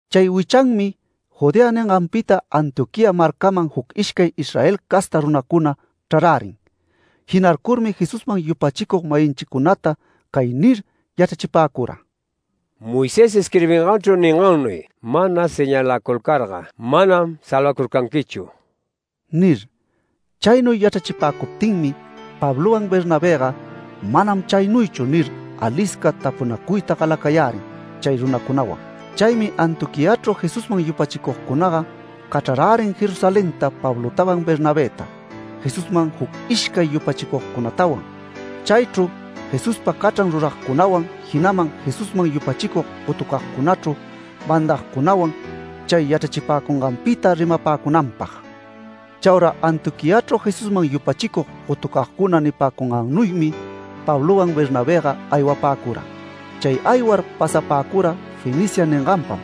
Chay wichanmi Judea ninganpita Antioquía marcaman juc ishcay Israel casta runacuna chrarärin. Jinarcurmi Jesusman yupachicug-mayinchicunata cay nir yachrachipäcura: “Moisés isquirbinganchru ningannuy mana señalacurcarga manam salvacurcanquichu” nir. Chaynuy yachrachipäcuptinmi Pablowan Bernabëga “Manam chaynuychu” nir, alisca tapunacuyta galacayärin chay runacunawan. Chaymi Antioquiachru Jesusman yupachicugcunaga cachrarärin Jerusalenta Pablotawan Bernabëta, Jesusman juc ishcay yupachicugcunatawan. Chaychru Jesuspa cachran ruragcunawan, jinaman Jesusman yupachicug gotucagcunachru mandagcunawan chay yachrachipäcunganpita rimapäcunanpag. Chaura Antioquiachru Jesusman yupachicug gotucagcuna nipäcungannuymi Pablowan Bernabëga aywapäcura. Chay aywar pasapäcura Fenicia ninganpam,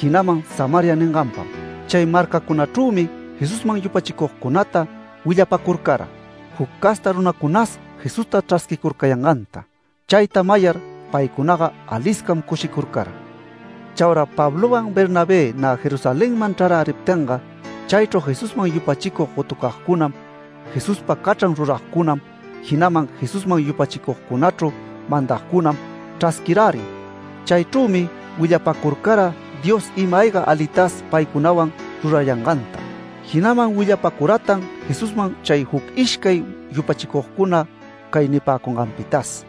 jinaman Samaria ninganpam. Chay marcacunachrümi Jesusman yupachicugcunata willapacurcara, juc casta runacunas Jesusta chrasquicurcayanganta. Chayta mayar paycunaga aliscam cushicurcara. Chaura Pablowan Bernabé nä Jerusalenman chraräriptinga, chaychru Jesusman yupachicug gotucagcunam, Jesuspa cachran ruragcunam, jinaman Jesusman yupachicugcunachru mandagcunam chrasquirärin. Chaychrümi willapacurcara Dios ima-ayga alitas paycunawan rurayanganta. Jinaman willapacuratan Jesusman chay juc ishcay yupachicugcuna cay nipäcunganpitas: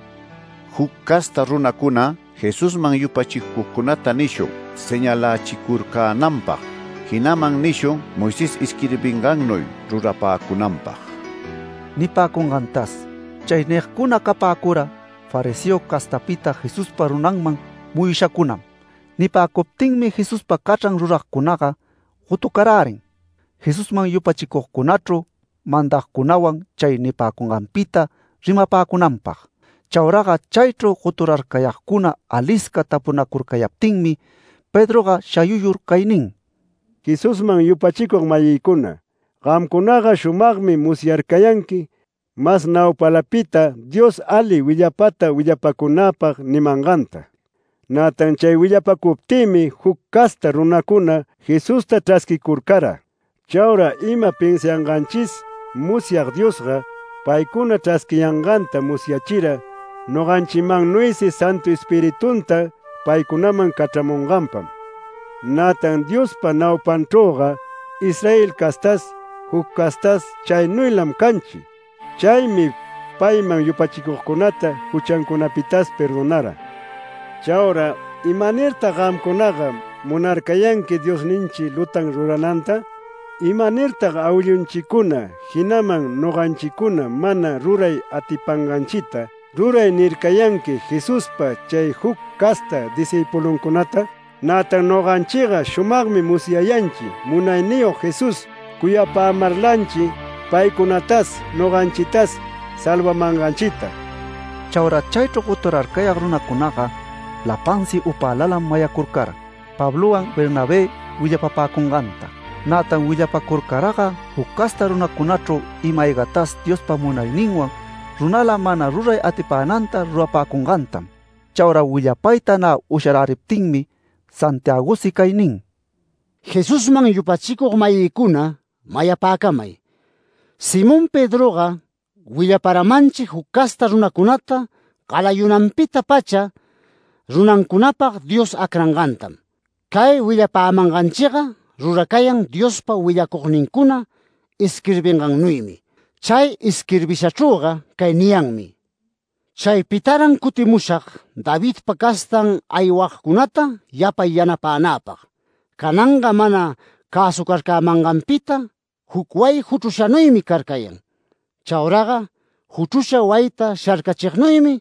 “Juc casta runacuna Jesusman yupachicugcunata nishun señalächicurcänanpag, jinaman nishun Moisés isquirbingannuy rurapäcunanpag” nipäcungantas. Chay nigcuna capäcura fariseo castapita Jesuspa runanman muyushacunam. Nipäcuptinmi Jesuspa cachran ruragcunaga gotucarärin Jesusman yupachicugcunachru mandagcunawan chay nipäcunganpita rimapäcunanpag. Chauraga chaychru goturarcayagcuna alisca tapunacurcayaptinmi, Pedroga shayuyur cay nin: “Jesusman yupachicug-mayïcuna, gamcunaga shumagmi musyarcayanqui mas naupalapita Dios ali willapata willapacunäpag nimanganta. Nätan chay willapacuptïmi juc casta runacuna Jesusta chrasquicurcara. Chaura ima pinsianganchis musyag Diosga, paycunata chrasquiyanganta musyachira noganchimannuysi Santu Espiritunta paycunaman cachramunganpam. Nätan Diospa naupanchrüga Israel castas, juc castas chaynuylam canchi. Chaymi payman yupachicugcunata juchancunapitas perdonara. Chaura ¿imanirtag gamcunaga munarcayanqui Diosninchi lutan rurananta? ¿Imanirtag awillunchicuna, jinaman noganchicuna mana ruray atipanganchita ‘Ruray’ nircayanqui Jesuspa chay juc casta discïpuluncunata? Nätan noganchiga shumagmi musyayanchi Munayniyog Jesús cuyapämarlanchi paycunatas noganchitas salvamanganchita”. Chaura chaychru goturarcayag runacunaga lapansi upälalam mayacurcara, Pablowan Bernabé willapapäcunganta. Nätan willapacurcaraga juc casta runacunachru ima-aygatas Diospa munayninwan runala mana ruray atipänanta rurapäcungantam. Chaura willapayta nä usharäriptinmi, Santiagosi cay nin: “Jesusman yupachicug-mayïcuna, mayapäcamay: Simón Pedroga willaparamanchi juc casta runacunata galayunanpita-pacha runancunapag Dios acrangantam. Cay willapämanganchiga ruracayan Diospa willacugnincuna isquirbingannuymi. Chay isquirbishachrüga cay niyanmi: ‘Chaypitaran cutimushag Davidpa castan aywagcunata yapay yanapänäpag. Cananga mana cäsucarcämanganpita juc wayi juchrushanuymi carcayan. Chauraga juchrusha wayita sharcachignuymi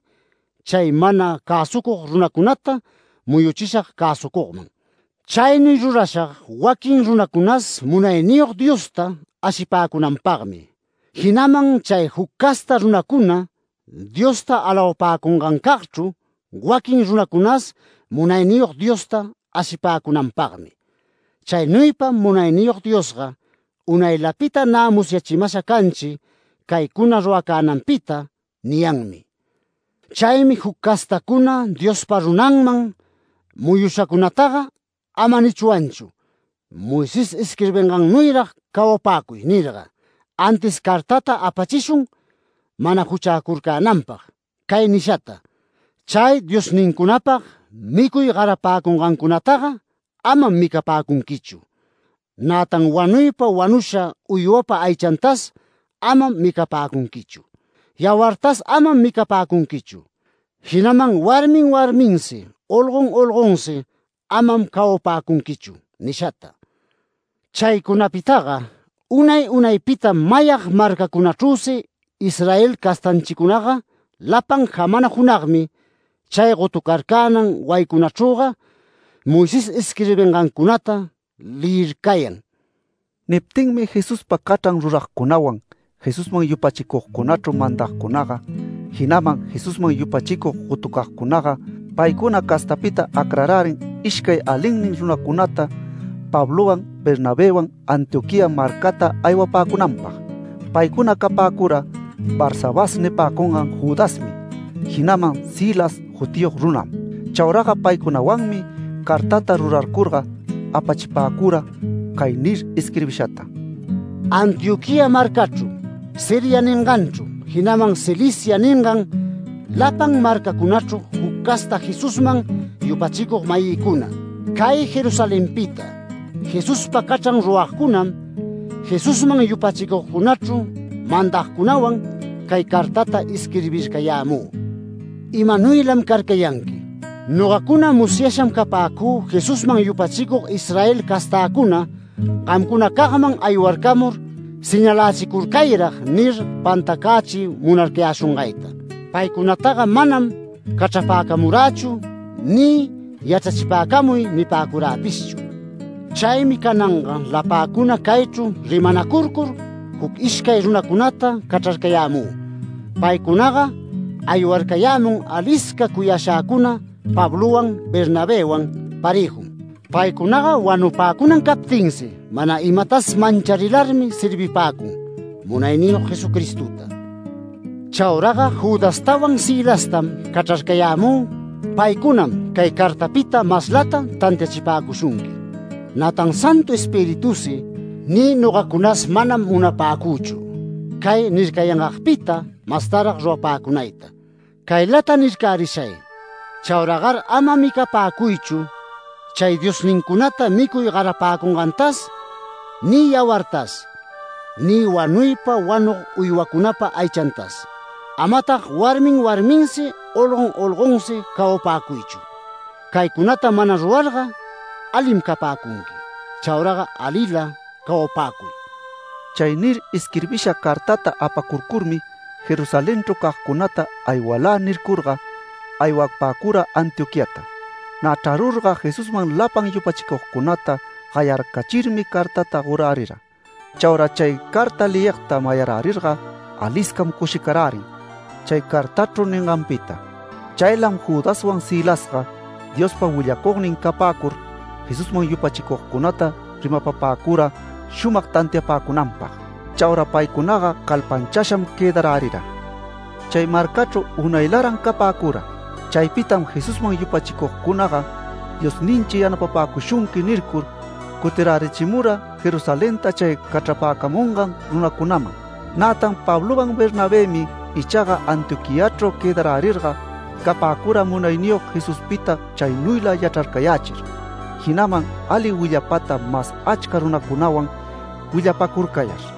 chay mana cäsucug runacunata muyuchishag cäsucugman. Chaynuy rurashag waquin runacunas Munayniyog Diosta ashipäcunanpagmi, jinaman chay juc casta runacuna Diosta alawapäcungancagchru waquin runacunas Munayniyog Diosta ashipäcunanpagmi. Chaynuypam Munayniyog Diosga unaylapita nä musyachimasha canchi caycuna ruracänanpita’ niyanmi. Chaymi juc castacuna Diospa runanman muyushacunataga ama nichwanchu: ‘Moisés isquirbingannuyrag cawapäcuy’ nirga. Antis cartata apachishun mana juchäcurcänanpag cay nishata: ‘Chay diosnincunapag micuy garapäcungancunataga amam micapäcunquichu, nätan wanuypa wanusha uywapa aychantas amam micapäcunquichu, yawartas amam micapäcunquichu, jinaman warmin warminsi olgon olgonsi amam cawapäcunquichu’ nishata. Chaycunapitaga unay unaypitam mayag marcacunachrüsi Israel castanchicunaga lapan jamana junagmi chay gotucarcänan wayicunachrüga Moisés isquirbingancunata leyircayan”. Niptinmi Jesuspa cachran ruragcunawan, Jesusman yupachicugcunachru mandagcunaga, jinaman Jesusman yupachicug gotucagcunaga, paycuna castapita acrarärin ishcay alinnin runacunata, Pablowan Bernabëwan Antioquía marcata aywapäcunanpag. Paycuna capäcura Barsabás nipäcungan Judasmi, jinaman Silas jutiyog runam. Chauraga paycunawanmi cartata rurarcurga apachipäcura cay nir isquirbishata: —“Antioquía marcachru, Siria ninganchru, jinaman Cilicia ningan lapan marcacunachru juc casta Jesusman yupachicug-mayïcuna: Cay Jerusalenpita Jesuspa cachran ruragcunam, Jesusman yupachicugcunachru mandagcunawan, cay cartata isquirbircayämü: ¡Imanuylam carcayanqui! Nogacuna musyasham capäcü Jesusman yupachicug Israel castäcuna, gamcunacagman aywarcamur ‘Señalächicurcayrag’ nir pantacächiy munarcayäshungayta. Paycunataga manam cachrapäcamurächu ni ‘Yachrachipäcamuy’ nipäcuräpishchu. Chaymi cananga lapäcuna caychru rimanacurcur juc ishcay runacunata cachrarcayämü. Paycunaga aywarcayämun alisca cuyashäcuna Pablowan Bernabëwan parëjum. Paycunaga wanupäcunan captinsi mana imatas mancharilarmi servipäcun Munayniyog Jesucristota. Chauraga Judastawan Silastam cachrarcayämü, paycunam cay cartapita maslata tantiachipäcushunqui. Nätan Santu Espiritusi ni nogacunas manam munapäcüchu cay nircayangagpita mastarag rurapäcunayta. Caylata nircärishay: Chauragar ama micapäcuychu chay diosnincunata micuy garapäcungantas, ni yawartas, ni wanuypa wanug uywacunapa aychantas. Amatag warmin warminsi olgon olgonsi cawapäcuychu. Caycunata mana rurarga alim capäcunqui. Chauraga alila cawapäcuy”.— Chay nir isquirbisha cartata apacurcurmi Jerusalenchru cagcunata “Aywalä” nicurga, aywapäcura Antioquiata. Nä chrarurga Jesusman lapan yupachicugcunata gayarcachirmi cartata gorärira. Chaura chay carta leyigta mayarärirga aliscam cushicarärin chay cartachu ninganpita. Chaylam Judaswan Silasga Diospa willacugnin capäcur, Jesusman yupachicugcunata rimapapäcura shumag tantiapäcunanpag. Chaura paycunaga calpanchasham quëdarärira. Chay marcachru unaylaran capäcura. Chaypitam Jesusman yupachicugcunaga “Diosninchi yanapapäcushunqui” nircur cutirärichimura Jerusalenta chay cachrapäcamungan runacunaman. Nätan Pablowan Bernabëmi ichaga Antioquiachru quëdarärirga, capäcura Munayniyog Jesuspita chaynuyla yachrarcayächir, jinaman ali willapata mas achca runacunawan willapacurcayar.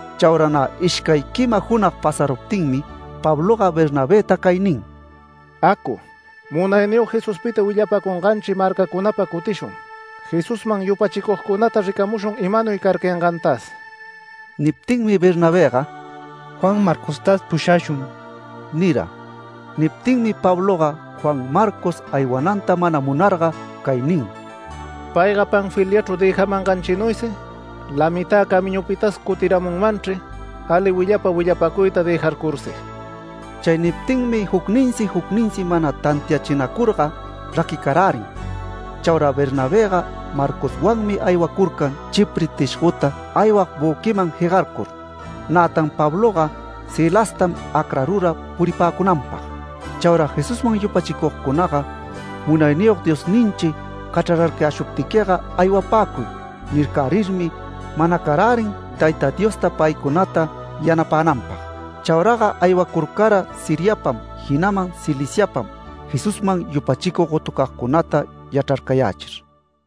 Chaura nä ishcay quima junag pasaruptinmi Pabloga Bernabëta cay nin: “Acu, Munayniyog Jesuspita willapacunganchi marcacunapa cutishun, Jesusman yupachicugcunata ricamushun imanuy carcayangantas”. Niptinmi Bernabëga “Juan Marcostas pushashun” nira. Niptinmi Pabloga Juan Marcos aywananta mana munarga cay nin: “Payga Panfiliachru dëjamanganchinuysi lamitä camiñupitas cutiramunmanchri ali willapa willapacuyta dëjarcursi”. Chay niptinmi jucninsi jucninsi mana tantiachinacurga raquicarärin. Chaura Bernabëga Marcoswanmi aywacurcan Chipre tishgota aywag büquiman jegarcur. Nätan Pabloga Silastam acrarura puripäcunanpag. Chaura Jesusman yupachicugcunaga “Munayniyog Diosninchi cachrarcayäshuptiquiga aywapäcuy” nircärirmi manacarärin Tayta Diosta paycunata yanapänanpag. Chauraga aywacurcara Siriapam, jinaman Ciliciapam, Jesusman yupachicug gotucagcunata yachrarcayächir.